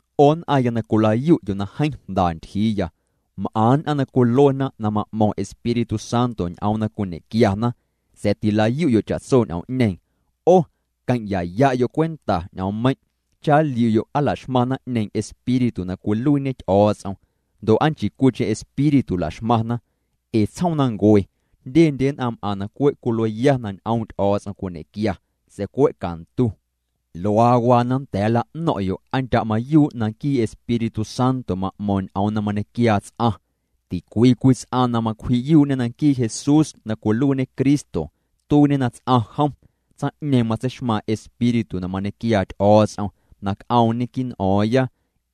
'O nn'aⁿya na cwilayu'yo' na jeeⁿ jnda ntyjiiya, m'aⁿ nn'aⁿ na cwiluena na ma'mo̱ⁿ Espíritu Santo ñ'oom na cwiñequiana, sa̱a̱ tilayu'yo' cha'tso ñ'oom'ñeeⁿ. 'O queⁿ'yaya'yo' cwenta ñ'oommeiⁿ' cha nliu'yo' aa laxmaⁿ naⁿ'ñeeⁿ Espíritu na cwiluiiñe Ty'o̱o̱ts'om ndo' aa nchii cwiicheⁿ espíritu laxmaⁿna. Ee tsjoomnancue jndyendye nn'aⁿ m'aⁿ na cwe' cwilueya na ñ'oom' Ty'o̱o̱ts'om cwiñequia sa̱a̱ cwe' cantu. Luaa waa na nnda̱a̱ nla'no̱ⁿ'yo' aa ndya' mayuu' na nquii Espíritu Santo ma'mo̱o̱ⁿ ñ'oom na mañequiaa ts'aⁿ. Ticwii cwii ts'aⁿ na macwji'yuu'ñe na nquii Jesús na cwiluiiñê Cristo tuiiñê na ts'aⁿ jom, tsaⁿ'ñeeⁿ matseixmaⁿ Espíritu na mañequiaa Ty'o̱o̱ts'om na c'oomñe quii' n'o̱o̱ⁿya.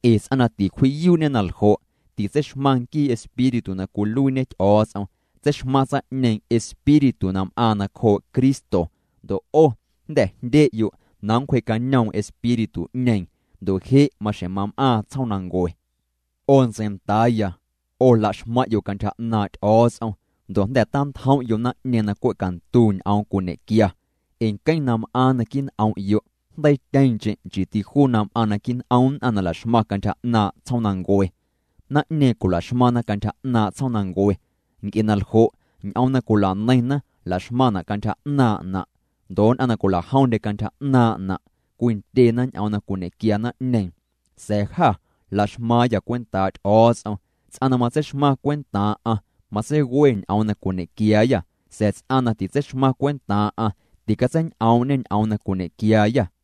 Ee ts'aⁿ na ticwji'yuu'ñe na ljo', titseixmaⁿ nquii Espíritu na cwiluiiñe Ty'o̱o̱ts'om, tseixmaⁿ tsaⁿ'ñeeⁿ espíritu na m'aaⁿ nacjoo' Cristo. Ndo' 'o jnda̱ jndye'yo' na nncwje'cañoom espíritu'ñeeⁿ ndo' je' maxjeⁿ mam'aaⁿ tsjoomnancue. 'O ntseindaaya, 'o laxmaⁿ'yo' cantyja 'naaⁿ' Ty'o̱o̱ts'om ndo' jnda̱ tantjom'yo' naⁿ'ñeeⁿ na cwe' cantu ñ'oom cwiñequia, ee nqueⁿ na m'aaⁿ naquii' n'om'yo' jndeiityeeⁿcheⁿ nchiiti juu na m'aaⁿ naquii' n'om nn'aⁿ na laxmaⁿ cantyja 'naaⁿ' tsjoomnancue. Naⁿ'ñeeⁿ cwilaxmaⁿna cantyja 'naaⁿ' tsjoomnancue, nc'e na ljo' ñ'oom na cwilaneiⁿna laxmaⁿna' cantyja 'naaⁿ'na'. Ndo' nn'aⁿ na cwilajomndye cantyja 'naaⁿ'na' cwindyena ñ'oom na cwiñequia naⁿ'ñeeⁿ. Sa̱a̱ jâ laxmaaⁿyâ cwentaa' Ty'o̱o̱ts'om. Ts'aⁿ na matseixmaⁿ cwentaaⁿ'aⁿ matseiwe ñ'oom na cwiñequiaayâ, sa̱a̱ ts'aⁿ na titseixmaⁿ cwentaaⁿ'aⁿ ticatseiñ'oom'ñe ñ'oom na cwiñequiaayâ.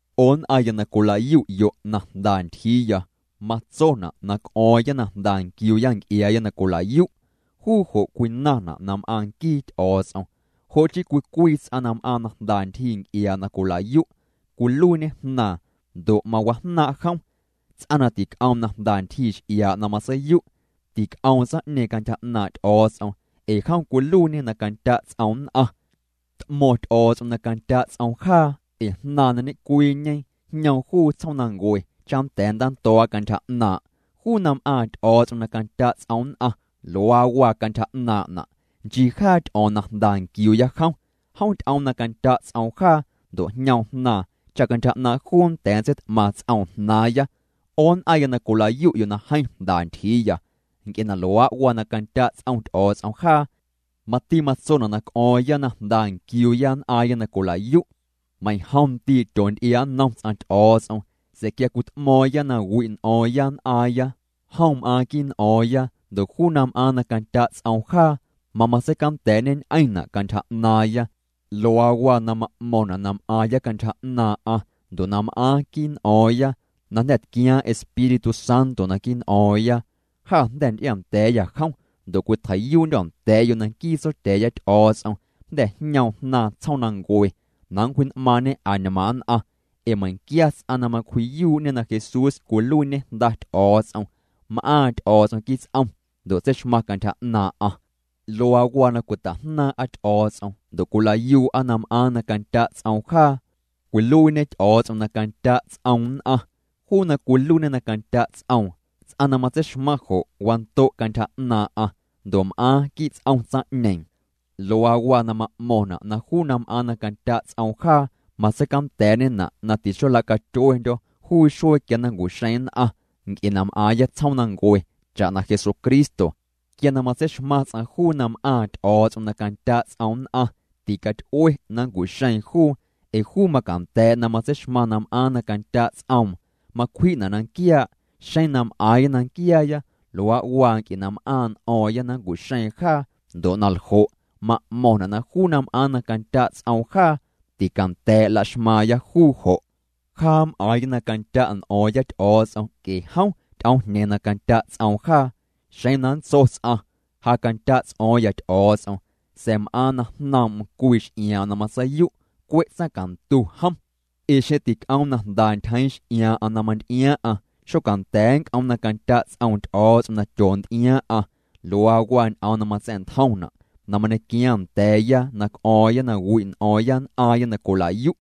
'O nn'aⁿya na cwila'yu'yo' na jnda ntyjiiya, matsona' na c'o̱o̱ⁿya na jnda nquiuuya nc'iaaya na cwila'yu'. Juu jo' cwinaⁿna' na m'aaⁿ nquii Ty'o̱o̱ts'om. Jo' chii cwii cwii ts'aⁿ na m'aaⁿ na jnda ntyjii nc'iaa' na cwilayu', cwiluiiñe jnaaⁿ ndo' mawajnaaⁿ' jom. Ts'aⁿ na tic'oom na jnda ntyjii x'iaa' na matseiyu' tic'oom tsaⁿ'ñeeⁿ cantyja 'naaⁿ' Ty'o̱o̱ts'om ee jom cwiluiiñê na candya' ts'oom nn'aⁿ. T'mo̱ⁿ Ty'o̱o̱ts'om na candya' ts'oom jaa ee Jnaaⁿ na ñecwiiñe jñoom juu tsjoomnancue cha nnda̱a̱ nntando̱o̱'a cantyja 'naaⁿ'. Juu na m'aaⁿ Ty'o̱o̱ts'om na candya' ts'oom nn'aⁿ, luaa waa cantyja 'naaⁿ'na'. Nchii jaa ty'o̱o̱ⁿ na jnda nquiuuya jom, jom ty'oom na candya' ts'oom jaa ndo' jñoom Jnaaⁿ cha cantyja 'naaⁿ' juu nnda̱a̱ nntseit'maⁿ ts'oom jnaaⁿya. 'O nn'aⁿya na cwila'yu'yo' na jeeⁿ jnda ntyjiiya, nc'e na luaa' waa na candya' ts'om Ty'o̱o̱ts'om jaa, mati matsona' na c'o̱o̱ⁿya na jnda nquiuuya nn'aaⁿya na cwilayu'. Meiⁿjom ndii' tyoonty'iaa' nnom ts'aⁿ Ty'o̱o̱ts'om sa̱a̱ quia cwit'mo̱o̱ⁿya na wi' n'o̱o̱ⁿya nn'aaⁿya, jom m'aaⁿ quii' n'o̱o̱ⁿya ndo' juu na m'aaⁿ na candya' ts'oom jaa, mamatseicanda̱a̱'ñeñ'eⁿna' cantyja 'naaⁿya. Luaa waa na ma'mo̱ⁿna' na m'aaⁿya cantyja 'naaⁿ'aⁿ ndo' na m'aaⁿ quii' n'o̱o̱ⁿya, na jnda̱ tquiaaⁿ Espíritu Santo naquii' n'o̱o̱ⁿya. Jâ jnda̱ nty'ianda̱a̱yâ jom ndo' cwitjei'yuu'ndyô̱ nda̱a̱'yo' na nquii Tsotya̱a̱ya Ty'o̱o̱ts'om jnda̱ jñoom Jnaaⁿ tsjoomnancue na nncwji'n'maaⁿñe añmaaⁿ nn'aⁿ. Ee meiⁿquia ts'aⁿ na macwji'yuu'ñe na Jesús cwiluiiñê Jnda Ty'o̱o̱ts'om, m'aaⁿ Ty'o̱o̱ts'om quii' ts'om ndo' tseixmaⁿ cantyja 'naaⁿ'aⁿ. Luaa waa na cwita'jnaaⁿ'a Ty'o̱o̱ts'om ndo' cwilayuu'a na m'aaⁿ na candya' ts'oom jaa. Cwiluiiñê Ty'o̱o̱ts'om na candya' ts'om nn'aⁿ. Juu na cwiluiiñê na candya ts'oom, ts'aⁿ na matseixmaⁿ jo', wando' cantyja 'naaⁿ'aⁿ ndo' m'aaⁿ quii' ts'om tsaⁿ'ñeeⁿ. Luaa waa na ma'mo̱ⁿna' na juu na m'aaⁿ na candya' ts'oom jaa matseicanda̱a̱'ñena' na tixola'catyuendyo̱ juu xuee quia na nncu'xeeⁿ nn'aⁿ, nc'e na m'aaⁿya tsjoomnancue cha'na Jesucristo. Quia na matseixmaⁿ ts'aⁿ juu na m'aaⁿ Ty'o̱o̱ts'om na candya' ts'oom nn'aⁿ ticaty'ue na nncu'xeeⁿ juu ee juu macanda̱a̱' na matseixmaⁿ na m'aaⁿ na candya' ts'oom, macwji'na' na nquiaa'. Xeⁿ na m'aaⁿya na nquiaaya, luaa' waa nc'e na m'aaⁿ' n'o̱o̱ⁿya na nncu'xeeⁿ jaa. Ndo' na ljo' ma'mo̱ⁿna' na juu na m'aaⁿ na candya' ts'oom jaa, ticanda̱a̱' laxmaaⁿya juu jo'. Jaa m'aaⁿya na candya' n'o̱o̱ⁿya Ty'o̱o̱ts'om nc'e jom ty'oomjñeeⁿ na candya' ts'oom jaa. Xeⁿ na nntso ts'aⁿ: “Ja candya' ts'o̱o̱ⁿya Ty'o̱o̱ts'om”, sa̱a̱ m'aaⁿ na jnoom'm cwii x'iaaⁿ'aⁿ na matseiyu', cwe' tsaⁿcantu jom. Ee xeⁿ tic'oom na jnda ntyjeeⁿ x'iaaⁿ'a na manty'iaaⁿ'aⁿ xonda̱a̱ nnc'oom na candya' ts'oom Ty'o̱o̱ts'om na tyoonty'iaaⁿ'aⁿ. Luaa waa ñ'oom na matsa̱'ntjomna' na mañequiaaⁿ nda̱a̱ya na c'o̱o̱ⁿya na wi' n'o̱o̱ⁿya nn'aaⁿya na cwila'yu'.